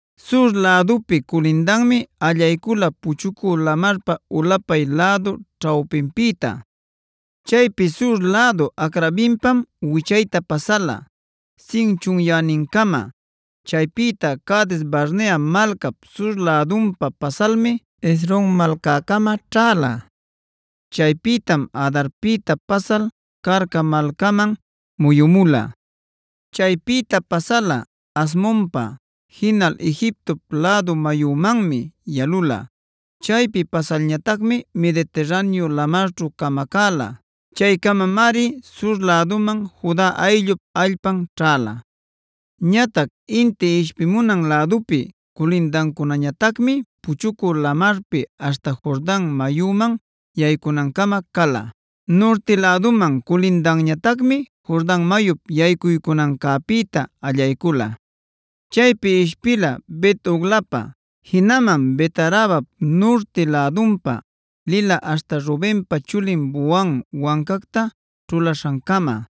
Sur lädupi culindanmi allaycula Puchucü Lamarpa ulapay lädu ćhawpinpïta. Chaypi sur lädu Acrabimpam wichayta pasala Zin chunyänincama. Chaypïta Cades-barnea malcap sur lädunpa pasalmi Hezron malcäcama ćhäla. Chaypïtam Adarpïta pasal Carca malcaman muyumula. Chaypïta pasala Asmonpa, jinal Egipto lädu mayumanmi yalula. Chaypi pasalñatacmi Mediterraneo lamarćhu camacäla. Chaycamamari Sur läduman Juda ayllup allpan ćhäla. Ñatac inti ishpimunan lädupi culindacunañatacmi Puchucü Lamarpi aśhta Jordan mayuman yaycunancama cala. Nurti läduman culindanñatacmi Jordan mayup yaycuycunancäpïta allaycula. Chaypi ishpila Bet-hoglapa, jinaman Bet-arabap nurti lädunpam lila aśhta Rubenpa chulin Bohan wancacta ćhulaśhancama.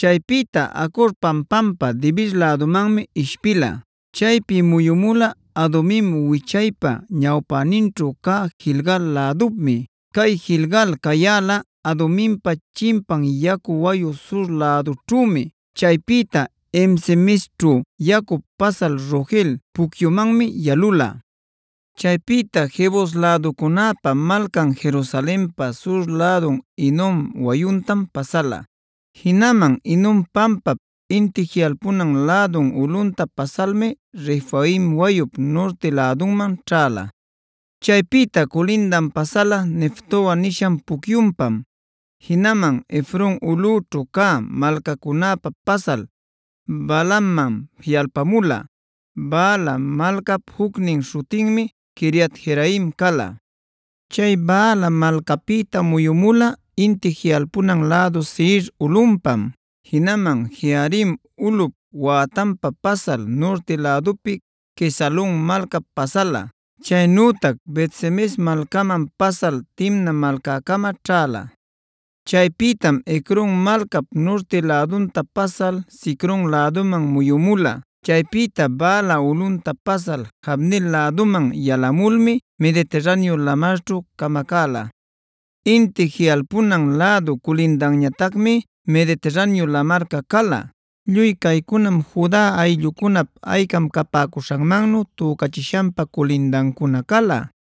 Chaypïta Acor pampampa Debir lädumanmi ishpila. Chaypi muyumula Adumin wichaypa ñawpäninćhu cä Gilgal lädupmi. Cay Gilgal cayäla Aduminpa chimpan yacu wayu sur lädućhümi. Chaypïta En-semesćhu yacup pasal Rogel pucyumanmi yalula. Chaypïta Jebus läducunäpa malcan Jerusalenpa sur lädun Hinom wayuntam pasala; jinaman Hinom pampap inti jiꞌalpunan lädun ulꞌunta pasalmi Refaim wayup nurti lädunman ćhäla. Chaypïta culindan pasala Neftoa nishan pucyunpam, jinaman Efron ulꞌućhu cä malcacunäpa pasal Baalaman jiꞌalpamula. Baala malcap jucnin śhutinmi Quiriat-jearim cala. Chay Baala malcapïta muyumula inti jiꞌalpunan lädu Seir ulꞌunpam, jinaman Jearim ulꞌup wätanpa pasal nurti lädupi Quesalon malcap pasala, chaynütac Bet-semes malcaman pasal Timna malcäcama ćhäla. Chaypïtam Ecron malcap nurti lädunta pasal Sicron läduman muyumula. Chaypïta Baala ulꞌunta pasal Jabneel läduman yalamulmi Mediterraneo lamarćhu camacäla. Inti jiꞌalpunan lädu culindanñatacmi Mediterraneo lamarca cala. Lluy caycunam Juda ayllucunap aycam capäcuśhanmannu tücachishanpa culindancuna cala.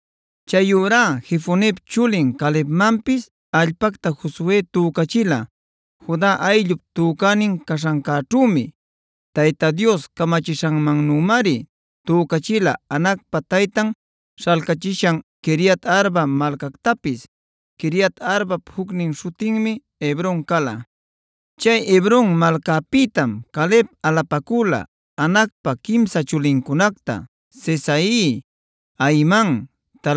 Chayurá Jefonep chulin Calebmanpis allpacta Josue tücachila Juda ayllup tücänin caśhancäćhümi. Tayta Dios camachishanmannümari tücachila Anacpa taytan śhalcachishan Quiriat-arba malcactapis. Quiriat-arbap jucnin śhutinmi Hebron cala. Chay Hebron malcapïtam Caleb alapacüla Anacpa quimsa chulincunacta: Sesai, Ahiman,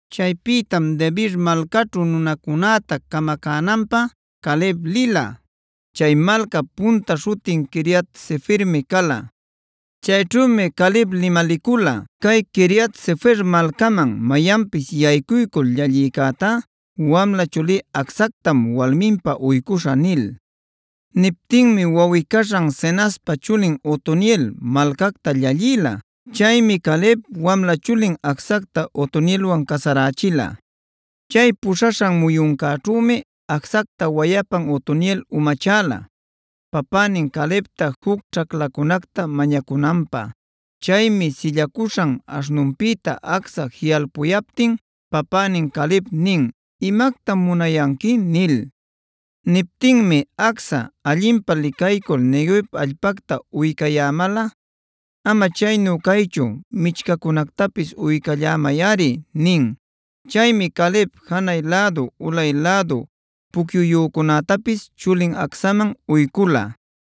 Chaypïtam Debir malcaćhu nunacunäta camacänanpä Caleb lila. Chay malcap punta śhutin Quiriat-sefermi cala. Chayćhümi Caleb limalicula: “Cay Quiriat-sefer malcaman mayanpis yaycuycul llallïcätá wamla chulí Acsactam walminpä uycuśhä” nil. Niptinmi wawꞌi-caśhan Cenazpa chulin Otoniel malcacta llallïla. Chaymi Caleb, wamla chulin Acsacta Otonielwan casarächila. Chay puśhaśhan muyuncäćhümi Acsacta wayapan Otoniel umachälab papänin Calebta juc ćhaclacunacta mañacunanpä. Chaymi sillacuśhan aśhnunpïta Acsa jiꞌalpucuyaptin papänin Caleb nin: “¿Imactam munayanqui?” nil. Niptinmi Acsa: “Allinpä licaycul Neguev allpacta uycayämalꞌa, ama chaynu caychu, michcacunactapisc uycallämayꞌari” nin. Chaymi Caleb janay lädu ulay lädu pucyuyücunätapis chulin Acsaman uycula.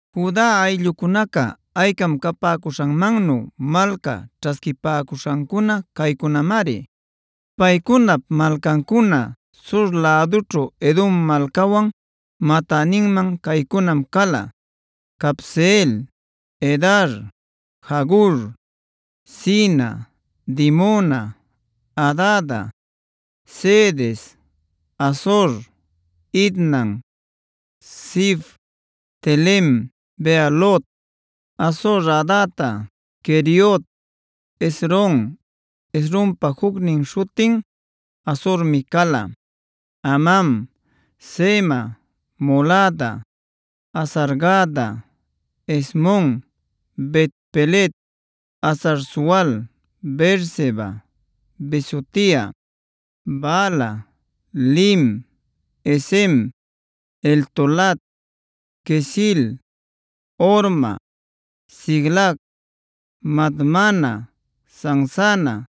Juda ayllucunaca aycam capäcuśhanmannu malca ćhasquipäcuśhancuna caycunamari. Paycunap malcancuna sur lädućhu Edom malcawan matäninman caycunam cala: Cabseel, Edar, Jagur, Cina, Dimona, Adada, Cedes, Hazor, Itnan, Zif, Telem, Bealot, Hazor-hadata, Queriot, Hezron (Hezronpa jucnin śhutin Hazormi cala), Amam, Sema, Molada, Hazar-gada, Hesmon, Bet-pelet, Hazar-sual, Beerseba, Bizotia, Baala, Iim, Ezem, Eltolad, Quesil, Horma, Siclag, Madmana, Sansana,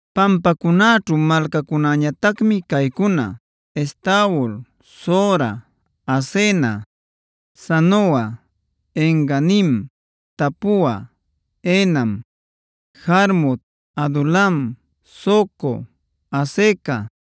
Pampacunaćhu malcacunäñatacmi caycuna: Estaol, Zora, Asena, Zanoa, En-ganim, Tapua, Enam, Jarmut, Adulam, Soco, Azeca,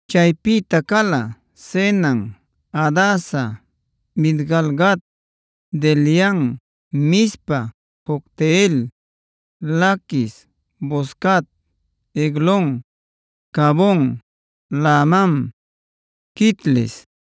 Chaypïta cala: Zenan, Hadasa, Midgal-gad, Dilean, Mizpa, Jocteel, Laquis, Boscat, Eglon, Cabon, Lahmam, Quitlis,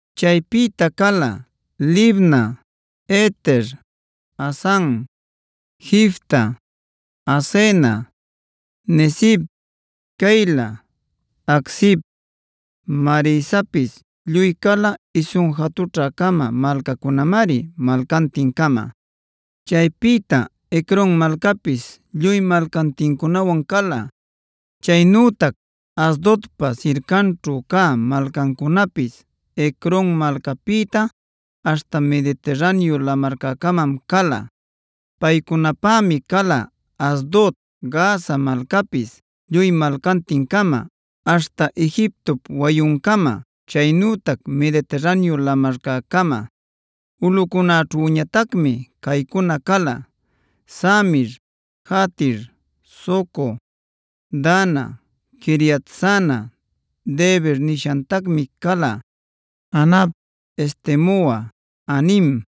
Chaypïta cala: Libna, Eter, Asan, Jifta, Asena, Nezib, Keila, Aczib, Maresapis. Lluy cala isun jatućhä-cama malcacunamari malcantin-cama. Chaypïta Ecron malcapis lluy malcantincunawan cala. Chaynütac Asdodpa sircanćhu cä malcancunapis, Ecron malcapïta aśhta Mediterraneo lamarcäcamam cala. Paycunapämi cala Asdod, Gaza malcapis lluy malcantin-cama, aśhta Egiptop wayuncama, chaynütac Mediterraneo lamarcäcama. Ulꞌucunäćhüñatacmi caycuna cala: Samir, Jatir, Soco, Dana, Quiriat-sana (Debir nishatacmi cala), Anab, Estemoa, Anim,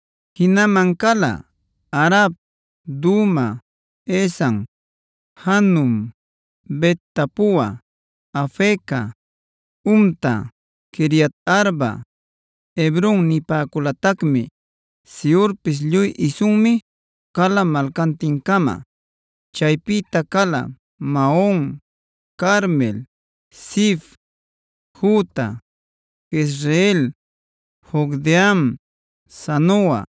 Jinaman cala: Arab, Duma, Esan, Janum, Bet-tapua, Afeca, Humta, Quiriat-arba (Hebron nipäculatacmi), Siorpis. Lluy isunmi cala malcantin-cama. Chaypïta cala: Maon, Carmel, Zif, Juta, Jezreel, Jocdeam, Zanoa,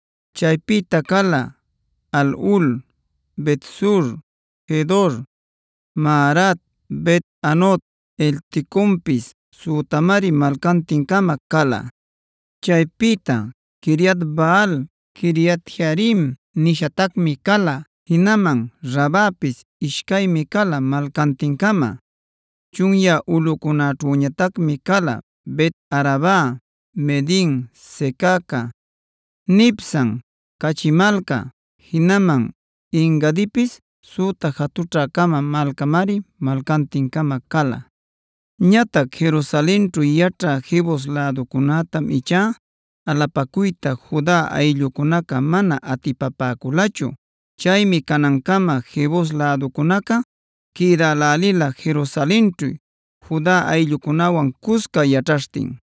Chaypïta cala: Halhul, Bet-sur, Gedor, Maarat, Bet-anot, Elteconpis. Sütamari malcantin-cama cala. Chaypïta: Quiriat-baal (Quiriat-jearim nishatacmi cala), jinaman Rabapis. Ishcaymi cala malcantin-cama. Chunyä ulꞌucunäćhüñatacmi cala: Bet-araba, Midin, Secaca, Nibsan, Caćhi Malca, jinaman En-gadipis. Süta jatućhä-cama malcamari malcantin-cama cala. Ñatac Jerusalenćhu yaćhä Jebus läducunätam ichá alapacuyta Juda ayllucunaca mana atipapäculachu. Chaymi canancama Jebus läducunaca quïdälälila Jerusalenćhu Juda ayllucunäwan cusca yaćhaśhtin.d